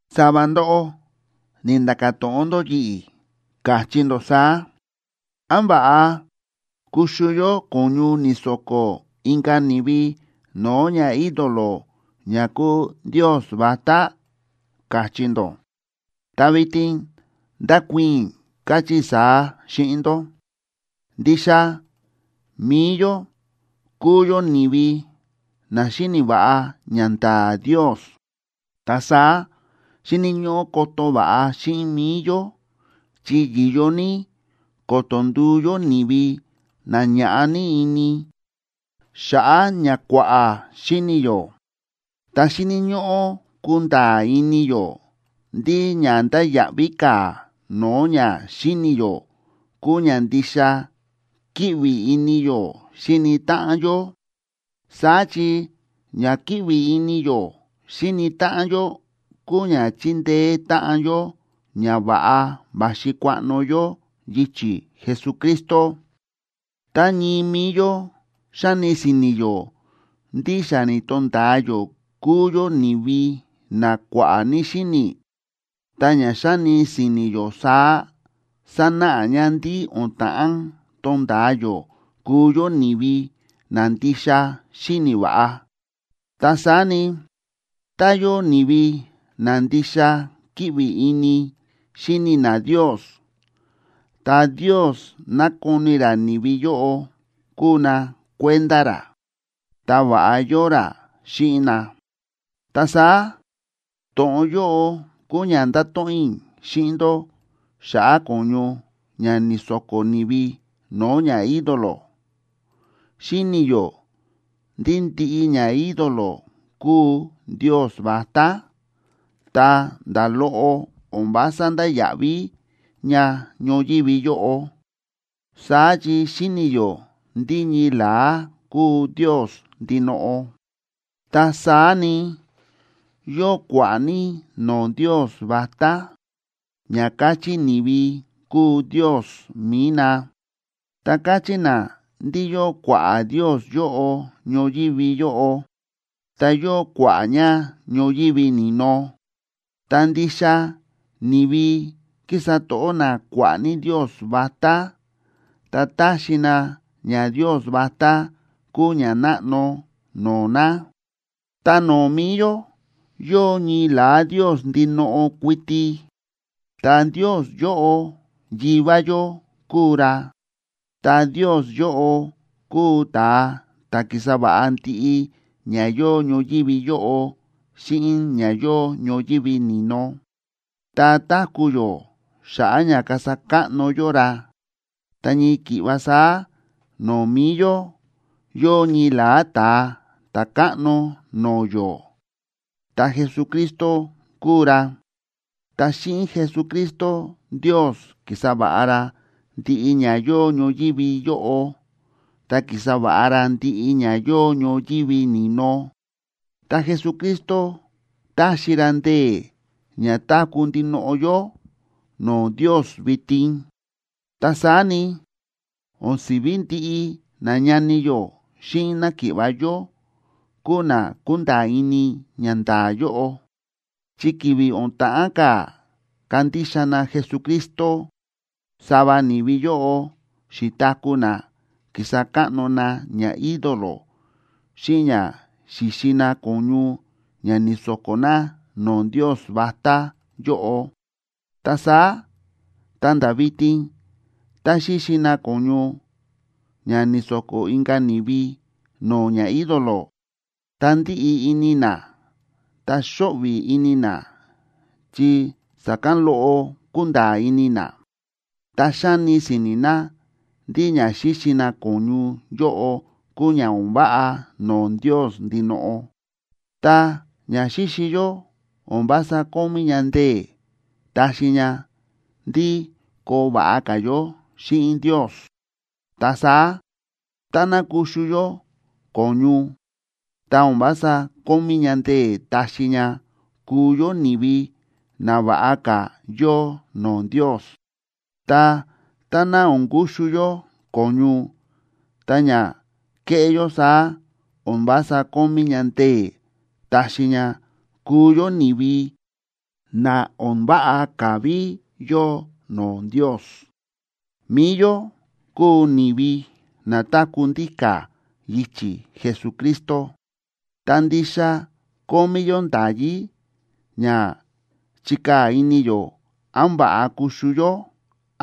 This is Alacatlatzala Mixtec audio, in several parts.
Sava ndóꞌó ni̱nda̱ka̱ to̱ꞌon ndó yi̱ꞌi̱, káchí ndó saá: “¿Án va̱ꞌa kuxu yó ko̱ñu ni̱so̱ko̱ inka̱ ni̱vi no̱o̱ ñaídolo ña kúu ndios vatá?”, káchí ndó. Ta vitin ndákuii̱n i̱, káchí i̱ saá xíꞌin ndó: Ndixa mi̱i yó kúu yó ni̱vi na xíni̱ va̱ꞌa ñanda̱a̱ Ndios. Ta saá xíni̱ ñóꞌó koto va̱ꞌa xíꞌin mi̱i yó, chi yi̱yo ní ko̱to̱ nduu yó ni̱vi na ña̱ꞌa ní ini xa̱ꞌa̱ ña kua̱ꞌa̱ xíni̱ yó. Ta xíni̱ ñóꞌó kunda̱a̱ ini yó ndí ña ndáya̱ꞌví ka̱ no̱o̱ ña xíni̱ yó kúu ña ndixa kíꞌvi ini yó xíni táꞌan yó. Saá chi ña kíꞌvi ini yó xíni táꞌan yó kúu ña chíndeé táꞌan yó ña va̱ꞌa va̱xi kuaꞌno yó yichi̱ Jesucristo. Tá ñii mi̱i yó xáni si̱ni̱ yó ndí xa ni̱to̱nda̱a yó kúu yó ni̱vi na kua̱ꞌa̱ ní xíni̱, ta ña xáni si̱ni̱ yó saá sánáꞌa ña ndí o̱n ta̱ꞌán tonda̱a yó kuu yó ni̱vi na ndixa xíni̱ va̱ꞌa. Ta saá ni, tá yóo ni̱vi na ndixa kíꞌvi ini xíni na Ndios, ta Ndios nákoni ra ni̱vi yóꞌo kúu na kuenda ra, ta va̱ꞌa yóo ra xíꞌin na. Ta saá, to̱ꞌon yóꞌo kúu ña ndáto̱ꞌon i̱ xíꞌin ndó xa̱ꞌa̱ ko̱ñu ña ni̱so̱ko̱ ni̱vi no̱o̱ ñaídolo. Xíni̱ yó ndí ndiꞌi ñaídolo kúu ndios vatá, ta nda̱ loꞌo o̱n vása ndáya̱ꞌví ña ñoyívi yóꞌo. Saá chi xíni̱ yó ndí ñii la̱á kúu Ndios ndinoꞌo. Ta saá ni, yóo kua̱ꞌa̱ ní no̱o̱ ndios vatá, ña káchí ni̱vi kúu ndios mi̱i na, ta káchí na ndí yóo kua̱ꞌa̱ ndios yóꞌo ñoyívi yóꞌo ta yóo kua̱ꞌa̱ ña ñoyívi ni̱no. Ta ndixa ni̱vi kísa to̱ꞌó na kua̱ꞌa̱ ní ndios vatá ta táxi na ñandios vatá kúu ñanáꞌno no̱o̱ na. Ta no̱o̱ mi̱i yó, yóo ñii la̱á Ndios ndinoꞌo kuiti, ta Ndios yóꞌo Yivá yó kúu ra. Ta Ndios yóꞌo kúu ta̱a ta̱ ki̱sa va̱ꞌa ndiꞌi ña yóo ñoyívi yóꞌo xíꞌin ña yóo ñoyívi ni̱no, ta táku̱ yó xa̱ꞌa̱ ña kasa káꞌno yó ra. Ta ñii ki̱ꞌva saá no̱o̱ mi̱i yó, yóo ñii la̱á Ta̱a Ta̱káꞌno no̱o̱ yó, ta Jesucristo kúu ra. Ta xíꞌin Jesucristo Ndios ki̱sa va̱ꞌa ra ndiꞌi ña yóo ñoyívi yóꞌo, ta ki̱sa va̱ꞌa ra ndiꞌi ña yóo ñoyívi ni̱no, ta Jesucristo táxi ra ndee̱ ña táku̱ ndinoꞌo yó no̱o̱ Ndios vitin. Ta saá ni, o̱n si̱ví ndiꞌi nañani yó xíꞌin náki̱ꞌva̱ yó kúu na kúnda̱a̱ ini ñanda̱a̱ yóꞌo. Chi ki̱vi̱ o̱n ta̱ꞌán ka̱ kandixa na Jesucristo, sava ni̱vi yóꞌo xi̱taku̱ na ki̱sa káꞌno na ñaídolo xíꞌin ña xi̱xi na ko̱ñu ña ni̱so̱ko̱ na no̱o̱ ndios vatá yóꞌo. Ta saá ta̱nda̱ vitin tá xíxi na ko̱ñu ña ni̱so̱ko̱ inka̱ ni̱vi no̱o̱ ñaídolo, ta ndíꞌi ini na ta xóꞌvi̱ ini na, chi sa̱kán loꞌo kúnda̱a̱ ini na, ta xáni si̱ni̱ na ndí ña xíxi na ko̱ñu yóꞌo kúu ña o̱n váꞌa no̱o̱ Ndios ndinoꞌo. Ta ña xíxi yó o̱n vása kómí ña ndee̱ taxi ña ndí koo va̱ꞌa ka̱ yó xíꞌin Ndios. Ta saá táná kuxu yó ko̱ñu, ta o̱n vása kómí ña ndee̱ taxi ña kuu yó ni̱vi na va̱ꞌa ka̱ yóo no̱o̱ Ndios. Ta táná o̱n kuxu yó ko̱ñu, ta ña kéꞌé yó saá o̱n vása kómí ña ndee̱ taxi ña kuu yó ni̱vi na o̱n váꞌa ka̱ ví yóo no̱o̱ Ndios. Mi̱i yó kúu ni̱vi na táku̱ ndíka̱ yichi̱ Jesucristo, ta ndixa kómí yó nda̱yí ña chikaa̱ ini yó án va̱ꞌa kuxu yó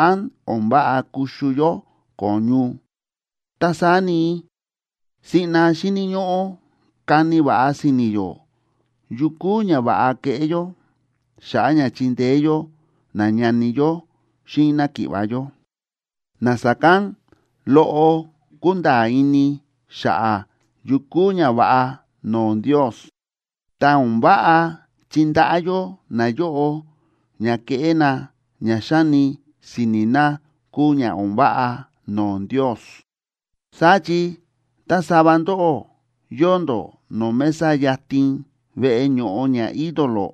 án o̱n váꞌa kuxu yó ko̱ñu. Ta saá ni, siꞌna xíni̱ ñóꞌó kani va̱ꞌa si̱ni̱ yó yu kúu ña va̱ꞌa keꞌé yó xa̱ꞌa̱ ña chindeé yó nañani yó xíꞌin náki̱ꞌva̱ yó, na sa̱kán loꞌo kúnda̱a̱ ini xa̱ꞌa̱ yu kúu ñava̱ꞌa no̱o̱ Ndios, ta o̱n váꞌa chindaꞌá yó nayóꞌo ña keꞌé na ña xáni si̱ni̱ na kúu ña o̱n váꞌa no̱o̱ Ndios. Saá chi tá sava ndóꞌó yóo ndó no̱o̱ mesa yatin veꞌe ño̱ꞌo ñaídolo,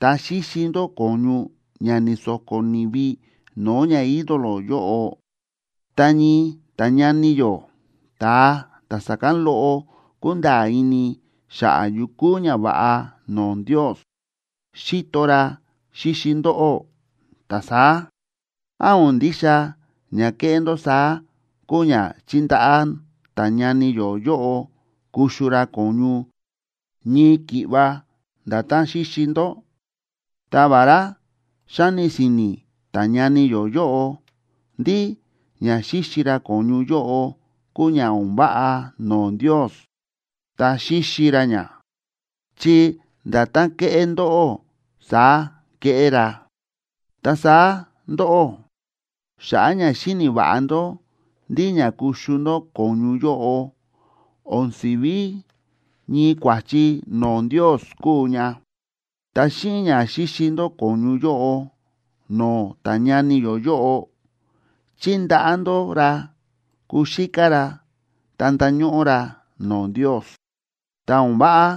ta xíxi ndó ko̱ñu ña ni̱so̱ko̱ ni̱vi no̱o̱ ñaídolo yóꞌo, ta ñii ta̱ñani yó ta̱a ta̱ sa̱kán loꞌo kúnda̱a̱ ini xa̱ꞌa̱ yu kúu ñava̱ꞌa no̱o̱ Ndios, xíto ra xíxi ndóꞌó, ta saá, ¿án o̱n ndixa ña kéꞌé ndó saá kúu ña chíndaꞌá ta̱ñani yó yóꞌo kuxu ra ko̱ñu ñii ki̱ꞌva nda̱tán xíxi ndó? Ta vará xáni si̱ni̱ ta̱ñani yó yóꞌo ndí ña xíxi ra ko̱ñu yóꞌo kúu ña o̱n váꞌa no̱o̱ Ndios, ta xíxi ra ña, chi nda̱tán kéꞌé ndóꞌó saá kéꞌé ra. Ta saá ndóꞌó, xa̱ꞌa̱ ña xíni̱ va̱ꞌa ndó ndí ña kuxu ndó ko̱ñu yóꞌo o̱n si̱ví ñii kua̱chi no̱o̱ Ndios kúu ña, ta xíꞌin ña xíxi ndó ko̱ñu yóꞌo no̱o̱ ta̱ñani yó yóꞌo chíndaꞌá ndó ra kuxíká ra ta ndañóꞌó ra no̱o̱ Ndios. Ta o̱n váꞌa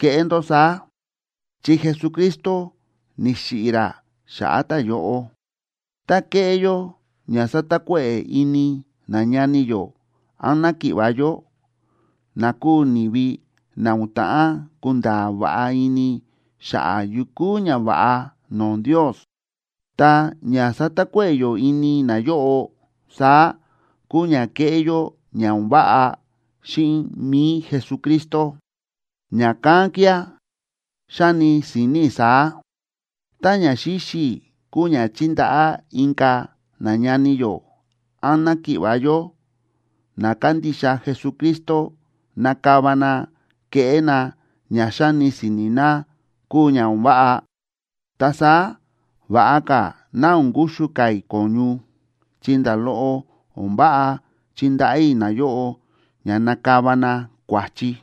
keꞌé ndó saá, chi Jesucristo ni̱xiꞌi̱ ra xa̱ꞌa̱ ta̱yóꞌo. Tá kéꞌé yó ña sátakuéꞌe̱ ini nañani yó án náki̱ꞌva̱ yó, na kúu ni̱vi na o̱n ta̱ꞌán kunda̱a̱ va̱ꞌa ini xa̱ꞌa̱ yu kúu ñava̱ꞌa no̱o̱ Ndios, ta ña sátakuéꞌe̱ yó ini nayóꞌo saá kúu ña kéꞌé yó ña o̱n váꞌa xíꞌin mi̱i Jesucristo. Ña̱kán kía̱, xáni si̱ni̱ i̱ saá: Tá ña xíxi i̱ kúu ña chíndaꞌá inka̱ nañani yó án náki̱ꞌva̱ yó na kándixa Jesucristo nakava na keꞌé na ña xáni si̱ni̱ na kúu ña o̱n váꞌa, ta saá va̱ꞌa ka̱ ná o̱n kuxu ka̱ i̱ ko̱ñu, chi nda̱ loꞌo o̱n váꞌa chindaꞌá i̱ nayóꞌo ña nakava na kua̱chi.